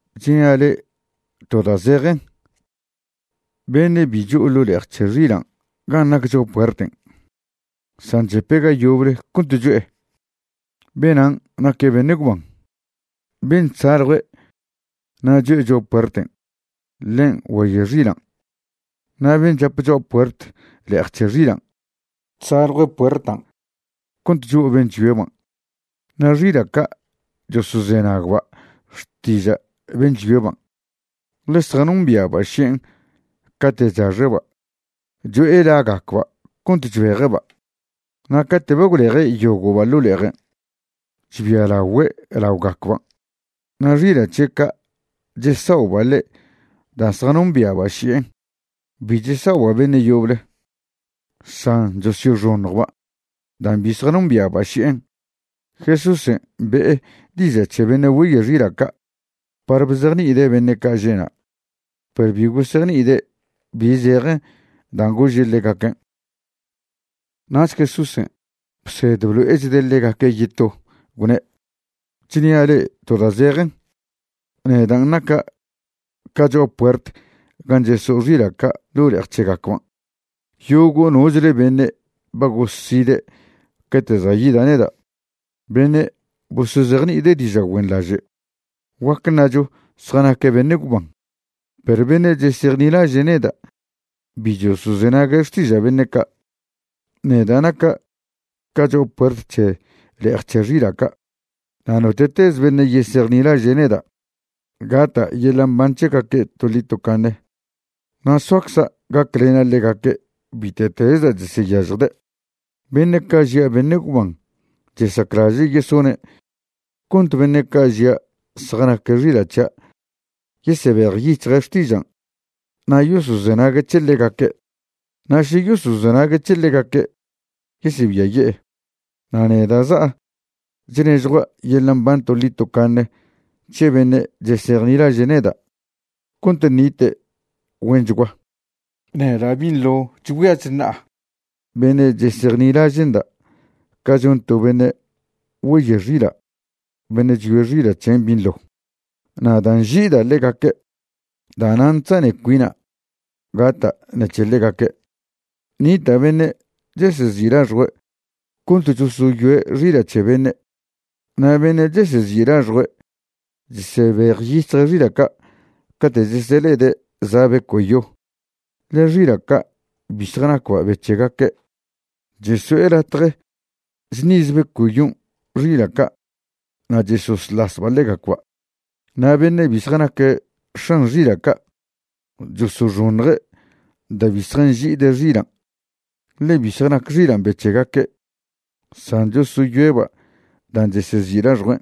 Chnia' le'e to da' zejen, beṉe' bi cho'o ḻo' le'ej c̱he xilan' gan' nac cho'a puerten' san chepe' ga yoble cont cho'e, benan' naque' beṉe' gwban. Ben' chsaljue' na' cho'e cho'a puerten', ḻen' güeyoe' xilan'. Na' ben' chap cho'a puert le'ej c̱he xilan' chsaljue' puertan' cont cho'o ben' chyoeban'. Na' xila' ca' chosozenagba' xtiža' ben' chyoeban', ḻe zjanombia'ba' ši'en cate' chaxe'ba' cho'e lagacba' cont chbeje'ba'. Na' cate' ba gwleje' yogo'ba' ḻo' le'ejen', chbialagüe' laogacban', na' xila' c̱he' ca' chesa'oba' ḻe' da' zjanombia'ba' ši'en. Bi chesa'oba' beṉe' yoble, san chosyoxoṉjba' dan' bi zjanombia'ba' ši'en. Jesúsen' be'e diža' c̱he beṉe' güeye' xila' ca' par bzejni'ide' beṉe' ca' že'na', perw bi gosejni'ide' bi zejen dan' gože' ḻegaquen'. Nach Jesúsen' bsed blo'echde' ḻegaque' yeto, gwne': ―Chnia' le'e to da' zejen, nedan' naca' ca cho'a puert gan' cheso'o xila' ca' ḻo' le'ej c̱hegacban'. Yogo' nochle beṉe' ba goside' cate' za' yida' neda', beṉe' bosozejni'ide' diža' güenḻaže', guac ṉacho zjanaque' beṉe' gwban. Perw beṉe' chesejnilaže' neda' bi chosozenague' xtiža' beṉe' ca'. Neda' naca' ca cho'a puert c̱he le'ej c̱he xila' ca'. Na' note'tez beṉe' yesejnilaže' neda', gata' yeḻa' mban c̱hegaque' toḻi tocaṉe na' soacza' gaclena' ḻegaque' bite'tez da' cheseyažjde'. ’Beṉe' ca' žia' beṉe' gwban chesaclaže' yesone' cont beṉe' ca' žia' zjanaque' xila' c̱hia' yesebejyic̱hje' xtižan' na' yosozenague' c̱he ḻegaque'. Na' še yosozenague' c̱he ḻegaque', yesebiaye'e. Na' neda' za'a chnežjua' yeḻa' mban toḻi tocaṉe c̱he beṉe' chesejnilaže' neda' cont ṉite' güenchgua. Neda' binḻo chgüia chṉa'a beṉe' chesejnilaže'nda' ca chon to beṉe' güeye' xila' beṉe' chyoe' xila' c̱hen' binḻo. Na' da' nži'ida' ḻegaque', da'nan' chzane cuina' gata' ṉec̱he ḻegaque'. Nita' beṉe' chesezi' laxjue' cont chosoyoe' xila' c̱he beṉe'. Na' beṉe' chesezi' laxjue' chesebejyic̱hje' xila' ca' cate' chesele'ede' za' beco'yo, ḻe xila' ca' bi zjanacba' be c̱hegaque'. Cheso'e latje chṉiz beco'yon' xila' ca' na' chesosḻasba' ḻegacba'. Na' beṉe' bi zjanaque' x̱an xila' ca' chosoxoṉje' da' bi zjanži'ide' xilan', ḻe bi zjanac xilan' be c̱hegaque', san chosoyoeba' dan' chesezi' laxjuen'.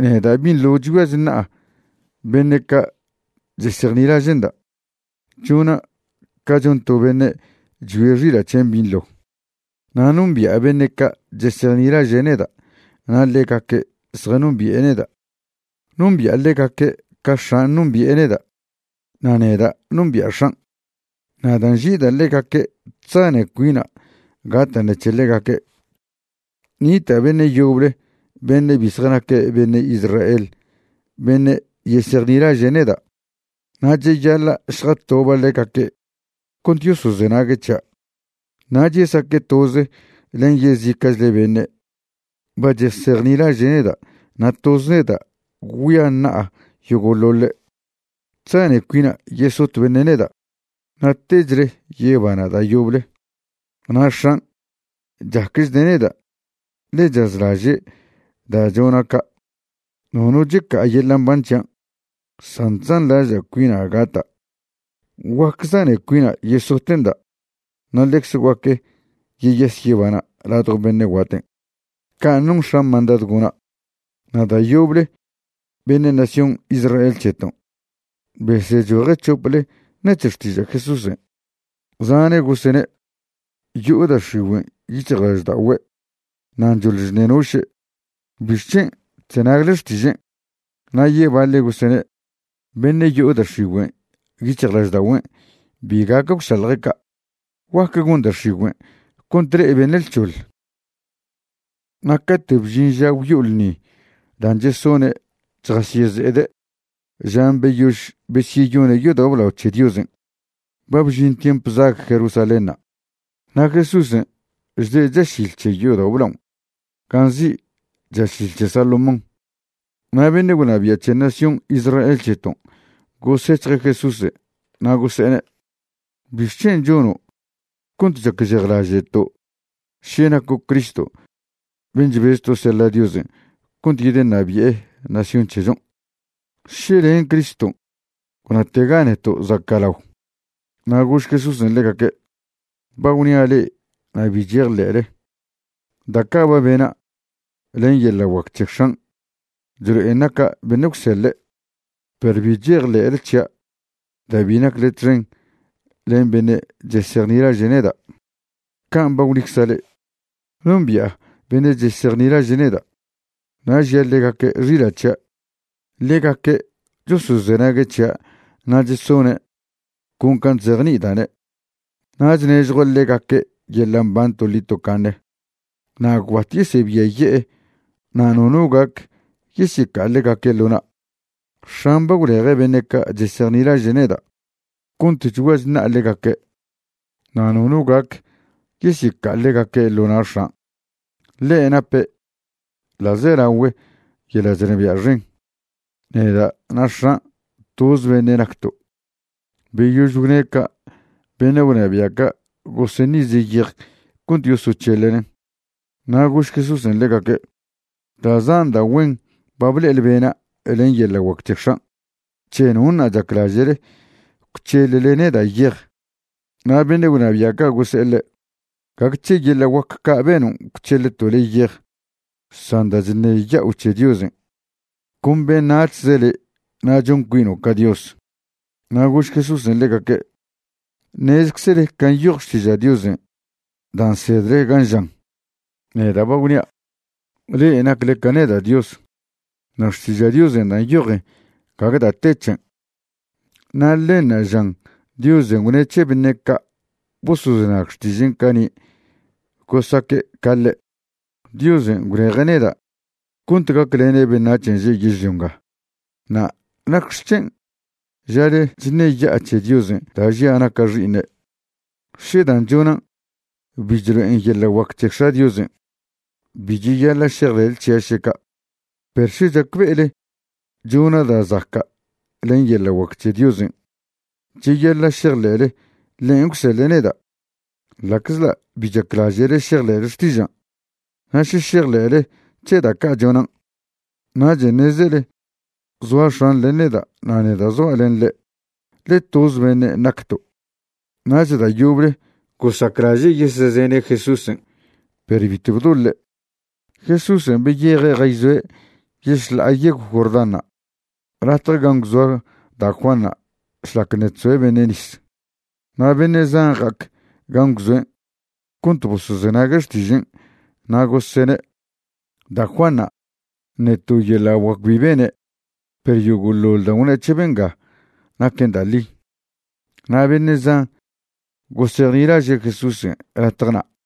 ’Neda' binḻo chgüia chṉa'a beṉe' ca' chesejnilaže'nda', chona' ca chon to beṉe' chyoe' xila' c̱hen' binḻo. Na' nombi'a beṉe' ca' chesejnilaže' neda' na' ḻegaque' zjanombi'e neda'. Nombi'a ḻegaque' ca X̱an' nombi'e neda' na' neda' nombi'a X̱an'. Na' da' nži'ida' ḻegaque' chzane cuina' gata' ṉec̱he ḻegaque'. Nita' beṉe' yoble beṉe' bi zjanaque' beṉe' Israel beṉe' yesejnilaže' neda'. Na' cheyaḻa' šjatoba' ḻegaque' cont yosozenague' c̱hia', nach yesaque' toze len yezica'chle beṉe' ba chesejnilaže' neda' na' toz neda' gwgüia ṉa'a yogo'ḻoḻe'. ’Chzane' cuina' yesot beṉe' neda', na' techle yebana' da' yoble. Na' X̱an' chacchde' neda' ḻe chazlaže' da' chona' ca'. Nono checa'a yeḻa' mban c̱hian' san chzanḻaže' cuina' gata'. Guac zane cuina' yesote'nda' na' ḻecz guac yeyas yebana' ladjo beṉe' guaten', can' non X̱an' mandadw gona'. Na' da' yoble beṉe' nación Israel c̱heton' besechoje' c̱hople ṉec̱he xtiža' Jesúsen'. Zane' gosene': ―Yo'o da' x̱igüen' yic̱hjlažda'ogüe', nan' choḻ chṉenoše'. ¿Bixc̱hen' chzenagle xtižen'? Na' yebaḻe' gosene': ―Beṉe' yo'o da' x̱igüen' yic̱hjlažda'ogüen' bi gac gwšalje' ca'. ¿Guac gon da' x̱igüe' cont le'e beṉe' lc̱hoḻ? Na' cate' bžin ža gwyo'o ḻṉi dan' chesone' chjasyeze'ede' žan' beyož besyeyone' yodao' blao c̱he Diosen', ba bžin tiemp zag Jerusalénṉa'. Na' Jesúsen' chde' chašil c̱he yodao' blaon' gan' nzi' Chašil c̱he Salomón. Na' beṉe' gwnabia' c̱he nación Israel c̱heton' gosec̱hje' Jesúsen' na' gose'ene': ―¿Bixc̱hen' chono' cont chacžejlaže'to' še naco' Cristo ben' chbezto' seḻa' Diosen' cont yedeṉabi'e nación c̱hechon'? Še len' Criston', gwnatega neto' zaca'lao. Na' gož Jesúsen' ḻegaque': ―Ba gwnia' le'e na' bi chejḻe'le. Da' ca' ba bena' len yeḻa' guac c̱he X̱an' chlo'en naca' beṉe' gwseḻe'. Perw bi chejḻe'le c̱hia' da' bi nacle txen len beṉe' chesejnilaže' neda', can' ba gwnicza' le'e. Nombi'a beṉe' chesejnilaže' neda', na' žia' ḻegaque' xila' c̱hia'. Ḻegaque' chosozenague' c̱hia' na' chesone' con can' chzejni'ida'ne'. Na' chnežjua' ḻegaque' yeḻa' mban toḻi tocaṉe na' gwbat yesebiaye'e na' nono gac yesyeca'a ḻegaque' ḻo na'. X̱an' ba gwleje' beṉe' ca' chesejnilaže' neda' cont chgüia chṉa'a ḻegaque'. Na' nono gac yesyeca'a ḻegaque' ḻo na' X̱an', ḻe nape' ḻa'zelagüe yeḻa' chnabia' xen. Neda' na' X̱an' toz beṉe' nacto'. Beyož gwne' ca' beṉe' gwnabia' ca' goseṉize' yej cont yosoc̱heḻenen'. Na' gož Jesúsen' ḻegaque': ―Da' zan da' güen ba ble'ele bena' len yeḻa' guac c̱he X̱an'. ¿C̱he nonṉa' chaclaže'le gwc̱heḻle neda' yej? Na' beṉe' gwnabia' ca' gose'e ḻe': ―Gague c̱he yeḻa' guac ca' benon' gwc̱heḻto' le' yej san da' chṉeya'o c̱he Diosen'. Con beṉac̱hze le' na' chon cuino' ca Dios. Na' gož Jesúsen' ḻegaque': ―Ṉezeczele can' nyoj Xtiža' Diosen' dan' nsedle gan' žan: “Neda' ba gwnia', le'e nacle ca neda' Dios.” Na' Xtiža' Diosen' da' nyojen gague da' te c̱hen', na' ḻenṉa' žan Diosen' gwne' c̱he beṉe' ca' bosozenag xtižen' cani' gosaque' ca ḻe'. Diosen' gwleje' neda' cont gaclena' beṉac̱hen' že' yežlio nga na' ¿nacxec̱hen' ža le'e chṉeya'a c̱he Diosen' da' žia' naca' Xi'iṉe'? Še dan' chonan' bi chlo'en yeḻa' guac c̱he X̱a' Diosen', bi cheyaḻa' šejḻe'le c̱hia' šeca'. Perw še chacbe'ele chona' da' zaca' len yeḻa' guac c̱he Diosen', cheyaḻa' šejḻe'le ḻen' gwseḻe' neda', ḻa'czḻa' bi chaclaže'le šejḻe'le xtižan'. Na' še šejḻe'le c̱he da' ca' chonan', nachen' ṉezele zoa X̱an' len neda' na' neda' zoa' len ḻe', ḻe toz beṉen' nacto'. Nach da' yoble gosaclaže' yesezene' Jesúsen' perw bitw bdoḻe'. Jesúsen' beyeje' jayzoe' yešḻa'a yegw Jordanṉa' latje gan' gwzoa da' Juanṉa' šlac ṉe' chzoe' beṉe' nis. Na' beṉe' zan ja'ac gan' gwzoen' cont bosozenague' xtižen' na' gosene': ―Da' Juanṉa' ṉe to yeḻa' guac bi bene', perw yogo'ḻoḻ dan' gwne' c̱he benga naquen da' ḻi. Na' beṉe' zan gosejnilaže' Jesúsen' latje na'.